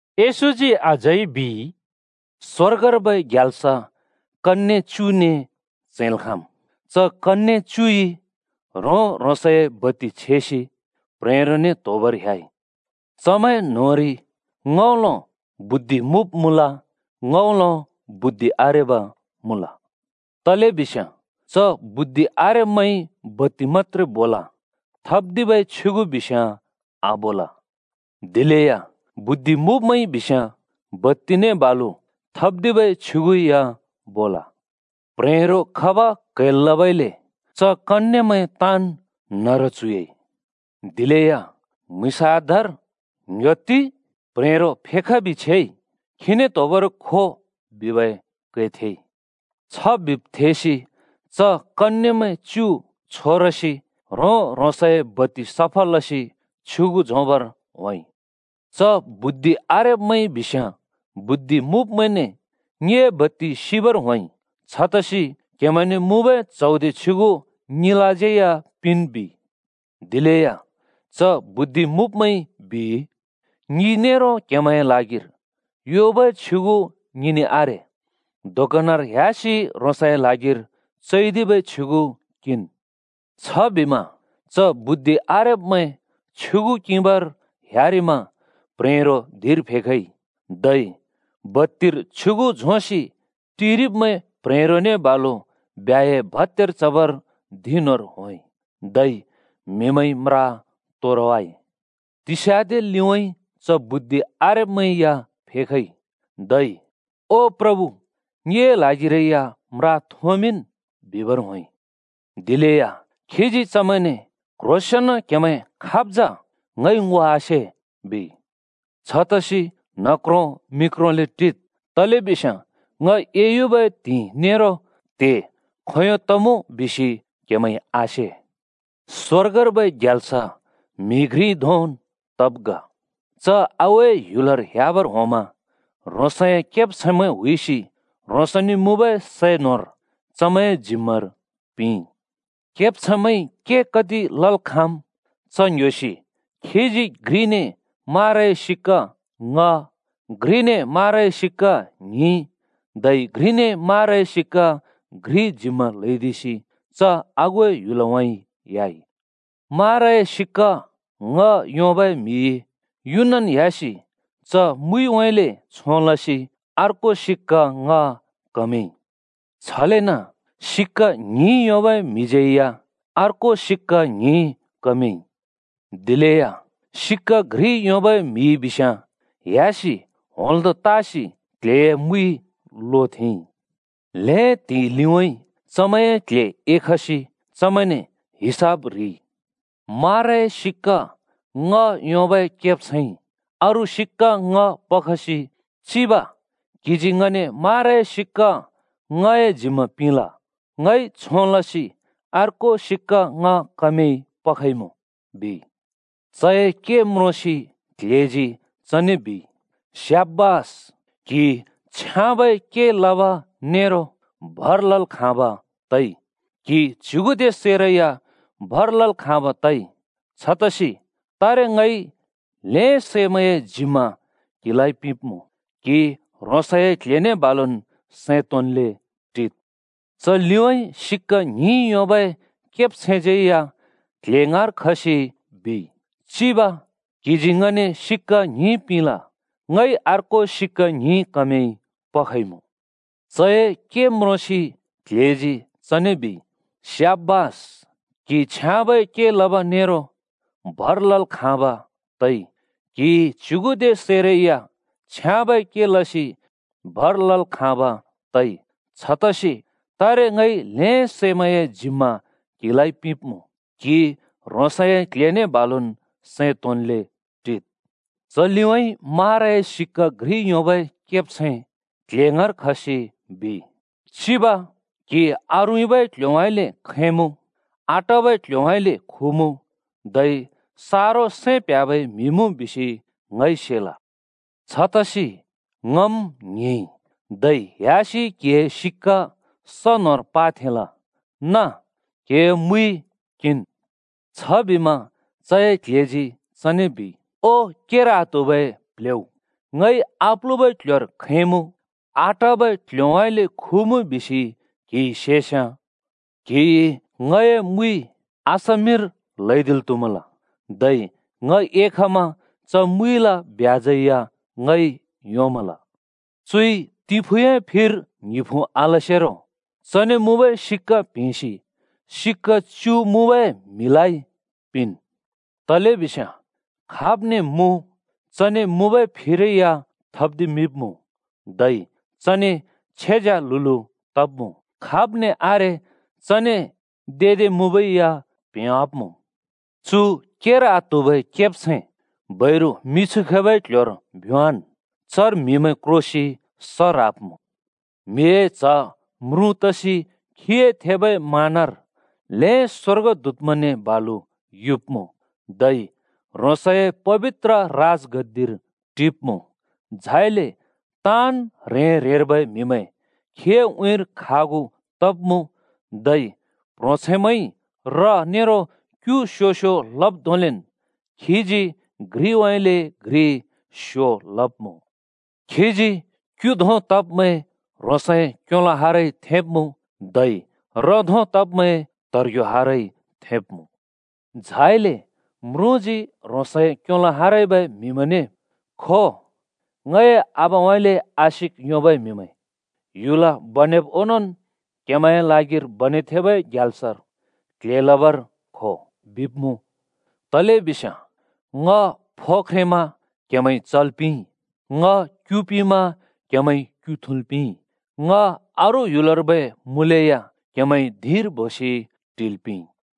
येशूजी अझै बिइ, “स्‍वर्गर्बै ग्याल्स कन्ये च्युने च्हैंल् खाँम्। च कन्ये च्युइ ह्रों-ह्रोंसए बत्ति छेसि प्ह्रेंरोने त्‍होबर ह्‍याइ। चमैं न्होंरि ङ्‍हउँलो बुद्धि मुँब् मुँल, ङ्‌हउँलो बुद्धि आरेबा मुँल। तलेबिस्याँ च बुद्धि आरेब्‍मैंइ बत्ति मत्‍त्रे बोल, थप्दिबै छ्युगु बिस्याँ आबोल। दिलेया बुद्धि मुँब्मैंइ बिस्याँ बत्तिने बालु थप्दिबै छ्युगु या बोल। प्ह्रेंरो खब क्‍हैल् लबइले च कन्येमैं ताँन् न्‍हरु च्‍हुइयाइ। “दिलेया म्‍हुँइँस आधार ‘ङ्‍ह्‍योत्ति! प्ह्रेंरो फेखबि छेइ! खीने त्‍होबर खो,’ बिबै कै थेइ। छ बिब् थेसि च कन्येमैं च्यु छोरसि ह्रों-ह्रोंसए बत्ति सफा लसि छ्युगु झोंबर होंइ। च बुद्धि आरेब्‍मैंइ बिस्याँ बुद्धि मुँब्मैंने ‘ङिए बत्ति सिबर होंइ! छतसि क्हेमैंने मुँबै च्हौदे छ्युगु ङिलाज्यै पिंन्,’ बिइ। दिलेया च बुद्धि मुँब्मैंइ बिइ, ‘ङि नेरो क्हेमैंए ल्हागिर योबै छ्युगु ङिने आरे। दोकनर ह्‍यासि ह्रोंसए ल्हागिर चैदिबै छ्युगु किंन्।’ “छबिमा च बुद्धि आरेब्‍मैं छ्युगु किंबर ह्‍यारिमा प्ह्रेंरो धिंर फेखइ, धै बत्तिर छ्युगु झोंसि टिरिब्मैं प्ह्रेंरोने बालुन् ब्ह्‍याए भत्‍यार चबर धिं न्‍होंर होंइ। धै म्हिमैंइ म्रा तोरवाइ। “तिस्‍याँदे लिउँइँ च बुद्धि आरेब्‍मैं या फेखइ, धै ‘ओ प्रभु, ङिए ल्हागिरै या म्रा थोंमिंन्,’ बिबर होंइ। दिलेया खीजी चमैंने ‘क्ह्रोंसेंन क्हेमैं खाब् जा ङइ ङो आसे,’ बिइ। “छतसि न्हक्रो मिक्रोले टिद्, तलेबिस्याँ ङ एयुबै त्हिंइ नेरो त्हे खोंयों तमुँ बिसि क्‍हेमैंइ आसे। “स्‍वर्गर्बै ग्याल्स म्हि घ्रि धोंन् तब् ग। च आगुए ह्‍युलर ह्‍याबर होंमा ह्रोंसए केब्छैंमैं हुइसि ह्रोंसने मुँबै सै न्होर चमैंए जिम्‍मार पिंइ। केब्छैंमैंइ के कति लल् खाँम् च ङ्‍ह्‍‍योसि खीजी घ्रिने माराए सिक्‍का ङ्‍ह, घ्रिने माराए सिक्‍का ङ्हिं, धै घ्रिने माराए सिक्‍का घ्रि जिम्‍मा ल्‍हैदिसि च आगुए ह्‍युलउँइँ ह्‍याइ। माराए सिक्‍का ङ्‍ह योंबै म्‍हिइ युनन् ह्‍यासि च मुइउँइँले छों लसि अर्को सिक्‍का ङ्‍ह कमदिइ। छलेन सिक्‍का ङ्हिं योंबै म्‍हिज्‍यै या अर्को सिक्‍का ङ्हिं कमदिइ। दिलेया सिक्‍का घ्रि योंबै म्‍हिइ बिस्‍याँ ह्‍यासि होंल्‍दों तासि क्ल्हेए मुइ लोथेंइ। “ल्‍हें त्हिंइ लिउँइँ चमैंए क्ल्हे एखसि चमैंने हिसाब ह्रिइ। माराए सिक्‍का ङ्‍ह योंबै केब्छैंइ अरू सिक्‍का ङ्‍ह पखसि ‘चिब, क्‍हिजी ङने माराए सिक्‍का ङ्‍हए जिम्मा पिंल। ङइ छों लसि अर्को सिक्‍का ङ्‍ह कमदिइ पखइमुँ,’ बिइ। “चए के म्रोंसि क्ल्हेजी चने बिइ, ‘स्‍याबास! क्‍हि छ्याँबै के लब नेरो भर लल् खाँब् तइ! क्हि च्युगुदे सैरै या भर लल् खाँब् तइ। छतसि तारे ङइ ल्‍हें सैमैंए जिम्मा क्हिलाइ पिंब्मुँ। क्हि ह्रोंसए क्ल्हेने बालुन् सैं तोंन्ले टिद्।’ “च लिउँइँ सिक्‍का ङ्हिं योंबै केब्छैंज्यै या क्ल्हे ङाँर खसि बिइ, ‘चिब, क्हिजी ङने सिक्‍का ङ्हिं पिंल। ङइ अर्को सिक्‍का ङ्हिं कमदिसि पखइमुँ।’ “चए के म्रोंसि क्ल्हेजी चने बिइ, ‘स्‍याबास! क्‍हि छ्याँबै के लब नेरो भर लल् खाँब् तइ! क्हिइ च्युगुदे सैरै या छ्याँबै के लसि भर लल् खाँब् तइ। छतसि तारे ङइ ल्‍हें सैमैंए जिम्मा क्हिलाइ पिंब्मुँ। क्हि ह्रोंसए क्ल्हेने बालुन् सैं तोंन्ले टिद्।’ “च लिउँइँ माराए सिक्‍का घ्रि योंबै केब्छैं क्ल्हे ङाँर खसि बिइ, ‘चिब! क्‍हि आरुँइँबै क्ल्ह्‍योउँइँले खैंमुँ, आटाबै क्ल्ह्‍योउँइँले खुमुँ, धै सारो सैं प्ह्‍याबै म्हि मुँ बिसि ङइ सेल। छतसि ङम् ङ्हिंइ, धै ह्‍यासि क्हिए सिक्‍का स न्होंर लोथेंल। नाँ, क्‍हिए मुइन् किंन्।’ “छबिमा चए क्ल्हेजी चने बिइ, ‘ओ केर आत्हुबै प्ल्हेउ! ङइ आप्लुबै क्ल्ह्‍योर खैंमुँ, आटाबै क्ल्ह्‍योउँइँले खुमुँ बिसि क्हिइ सेस्याँ क्‍हिइ ङए मुइ बैंकर थेंल् त्‍हुमल। धै ङ एखमा च मुइला ‍ब्याजै या ङइ योंमल।’ चुइ तिंफुँए फिर ङ्हिंफुँ आलसेरो ‘चने मुँबै सिक्‍‍का प्‍हेंसि सिक्‍का च्यु मुँबै म्‍हि पिंन्। तलेबिस्याँ खाब्ने मुँ, चने मुँबै फिरै या थप्दिमिंब्मुँ, धै चने छ्येज्याल्हुल्हु तब्‍मुँ। खाब्ने आरे चने देदे मुँबै या प्‍हेंवाँब्मुँ। चु केर आत्हुबै केब्छैं बैरु मिछु खैबै क्‍ल्‍ह्‍योर भ्‍योंवाँन्, चर म्‍हिमैं क्रोसि स ह्राब्‍मुँ।’ “म्हिए च्ह म्रुँ तसि खीए थेबै मानर ल्हें स्‍वर्गदूतमैंने बालुन युब्मुँ, धै ह्रोंसए पबित्र राजगद्दिर टिब्‍मुँ, झाइले ताँन् ह्रें-ह्रेंर्बै म्‍हिमैं खीए उँइँर खागु तब्‍मुँ, धै प्‍ह्रोंछैंमैंइ र नेरो क्यु स्यो-स्यो लब् धोंलेन् खीजी घ्रिउँइँले घ्रि स्यो लब्मुँ। खीजी क्‍यु धों तब्‍मैं ह्रोंसए क्योलो हारइ थेंब्मुँ, धै र धों तब्‍मैं त्हेब्रे हारइ थेंब्‍मुँ। झाइले म्रुँजी ह्रोंसए क्‍योलो हारबै म्‍हिमैंने ‘खो, ङए आबाउँइँले आशिक योंबै म्‍हिमैं, ह्‍युल बनेब् ओंनोंन् क्‍हेमैंए ल्हागिर बनेथेंबै ग्याल्सर क्ल्हे लबर खो,’ बिब्मुँ। तलेबिस्याँ ङ फो ख्रेंमा क्‍हेमैंइ चल् पिंइ। ङ क्‍यु पिमा क्हेमैंइ क्‍यु थुँल् पिंइ। ङ अरू ह्‍युलर्बै मुँलेया क्‍हेमैंइ धिंर बोसि टिल् पिंइ।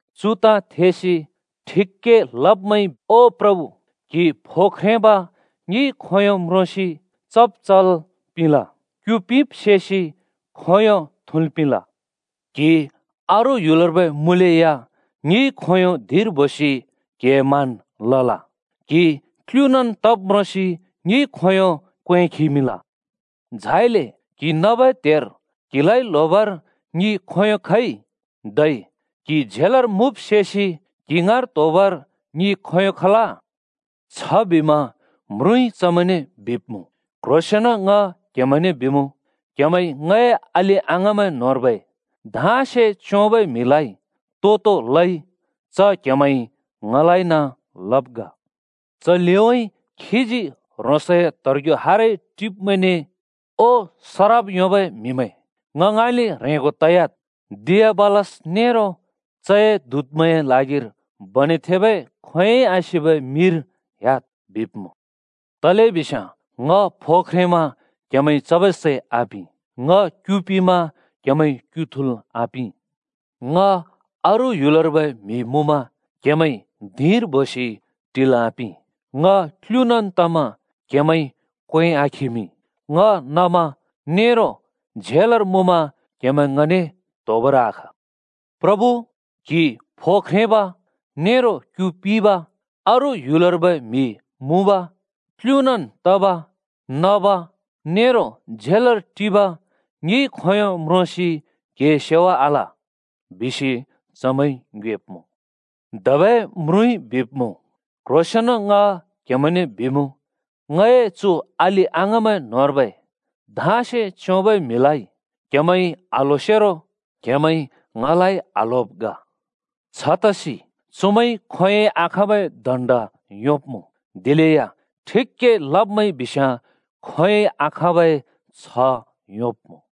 “चु ताँ थेसि ठिक के लब्मैंइ ‘ओ प्रभु, क्‍हि फो ख्रेंब ङिइ खोंयों म्रोंसि चब् चल् पिंल? क्‍यु पिब् सेसि खोंयों थुँल् पिंल?’ बिब्मुँ। ‘क्‍हि अरू ह्‍युलर्बै मुँलेया ङिइ खोंयों धिंर बोसि क्‍हिए मान लल? क्‍हि क्‍लुनान् तब् म्रोंसि ङिइ खोंयों क्वें खिमिंल? झाइले क्‍हि नबै त्हेर क्हिलाइ ल्होबर ङि खोंयों खइ? धै क्हि झेलर मुँब् सेसि क्हि ङाँर त्होबर ङि खोंयों खल?’ “छबिमा म्रुँइ चमैंने बिब्मुँ, ‘क्ह्रोंसेंन ङ क्हेमैंने बिमुँ, क्हेमैंइ ङए अलि-अङाँमैं न्होंर्बै धाँसे च्योंबै म्हिलाइ तो-तो लइ, च क्हेमैंइ ङलाइन लब् ग।’ “च लिउँइँ खीजी ह्रोंसए त्हेब्रे हारइ टिब्‍मैंने ‘ओ सराप योंबै म्हिमैं! ङ ङाँइँले ह्रेंगो तयाद्। दियाबलस नेरो चए दूतमैंए ल्हागिर बनेथेंबै खोंयोंइ आसिबै मिर ह्‍याद्,’ बिब्मुँ। तलेबिस्याँ ङ फो ख्रेंमा क्‍हेमैंइ चबै सै आपिं, ङ क्‍यु पिमा क्‍हेमैंइ क्‍यु थुँल् आपिं। ङ अरू ह्‍युलर्बै म्हि मुँमा क्‍हेमैंइ धिंर बोसि टिल् आपिं। ङ क्‍लुनान् तमा क्‍हेमैंइ क्‍वें आखिमिं। ङ नमा नेरो झेलर मुँमा क्‍हेमैं ङने त्होबर आखा। “‘प्रभु, क्‍हि फो ख्रेंब नेरो क्यु पिब, अरू ह्‍युलर्बै म्हि मुँब, क्‍लुनन् तब, नब, नेरो झेलर टिब ङिइ खोंयों म्रोंसि क्हिए सेवा आल?’ बिसि चमैंइ ङ्योएब्मुँ। “धबै म्रुँइ बिब्मुँ, ‘क्‍ह्रोंसेंन ङ क्हेमैंने बिमुँ, ङए चु अलि-अङाँमैं न्होंर्बै धाँसे च्योंबै म्हिलाइ क्‍हेमैंइ आल्होसेरो क्‍हेमैंइ ङलाइ आल्होब् ग।’ “छतसि चुमैंइ खोंयोंइ आखाँबै दण्‍ड योंब्‍मुँ, दिलेया ठिक के लब्मैंइ बिस्याँ खोंयोंइ आखाँबै छ्ह योंब्‍मुँ।”